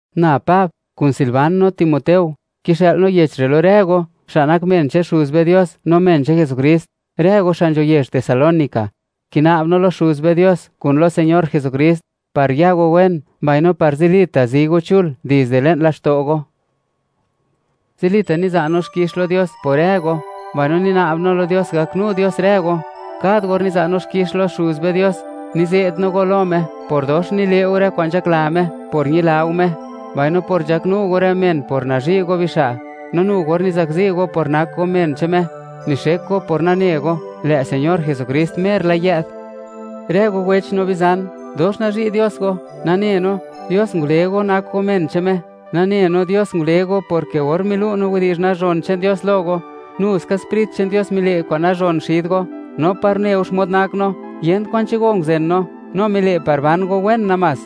Na Pab, kun Silvan no Timoteo; kixë'l no yech re' lo rë go, xa' nak men che'n Xuz be Dios no men che'n Jesukrist, rë go xa' nzho yezh Tesalónica. Kina'b no lo Xuz be Dios, kun lo Señor Jesukrist, par ya go wen, mbaino par zilita' zi go chul dizde le'n laxto' go. Zilita' niza' no xkix lo Dios por rë go, mbaino nina'b no lo Dios gaknu Dios rë go. Kad or niza' no xkix lo Xuz be Dios, nize't no go lo Me por dox nile' go rë kwa'n nzhakla Me por ñila go Me, mbaino por nzhaknu go rë men por nazhi' go bixa'. No nu or nizakzi go por nak go men che'n Me, nixek go por nane go, lë' Señor Jesukrist mer la yë'd. Rë go wech no bizan, dox nazhi' Dios go, nane no, Dios ngule go nak go men che'n Me. Nane no Dios ngule go porke or milu' no widi'zh nazhon che'n Dios lo go, nu ska Sprit che'n Dios mile' kwa'n nazhon xid go, no par une go xmod nak no, yent kwan che'n go nguzen no; no mile' par ban go wen namás.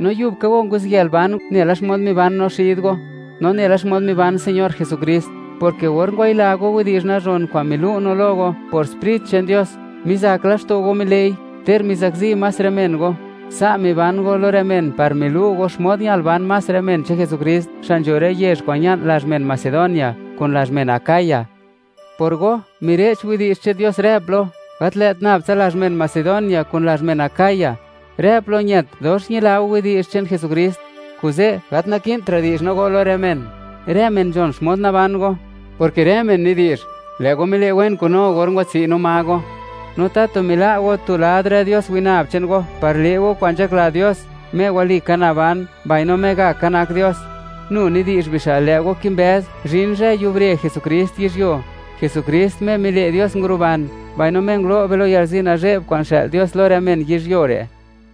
No yub ka go nguziyël ban nela xmod miban no xid go, no nela xmod miban Señor Jesukrist, porke or ngwayila go widi'zh nazhon kwa'n milu' no lo go, por Sprit che'n Dios, mizak laxto' go mile'i, ter mizakzi más rë men go. Sa' miban go lo rë men par milu' go xmod ñal ban más rë men che'n Jesukrist, xa' nzho rë yezh kwa'n ña'n lazh men Macedonia, kun lazh men Acaya. Por go, mire'ch widi'zh che'n Dios rë plo, gat lë't nab tsa lazh men Macedonia kun lazh men Acaya. Rë plo ñët, dox ñila go widi'zh che'n Jesukrist; kuze', gat naki'ntra' di'zh no go lo rë men, rë men nzhon xmod naban go, porke rë men nidi'zh, lë' go mile' wen kun no or ngwatsi' no ma go, no tatu mila' go tu lad rë dios winab che'n go, par le' go kwa'n nzhakla Dios, Me walika naban mbaino Me gaka nak Dios. Nu nidi'zh bixa' lë' go kimbëz, zhin zhë yubre Jesukrist yizhyuo; Jesukrist, Me mile' Dios nguruban, mbaino Me ngulo' be lo yalzi nazhe'b kwa'n xë'l Dios lo rë men yizhyuo re'.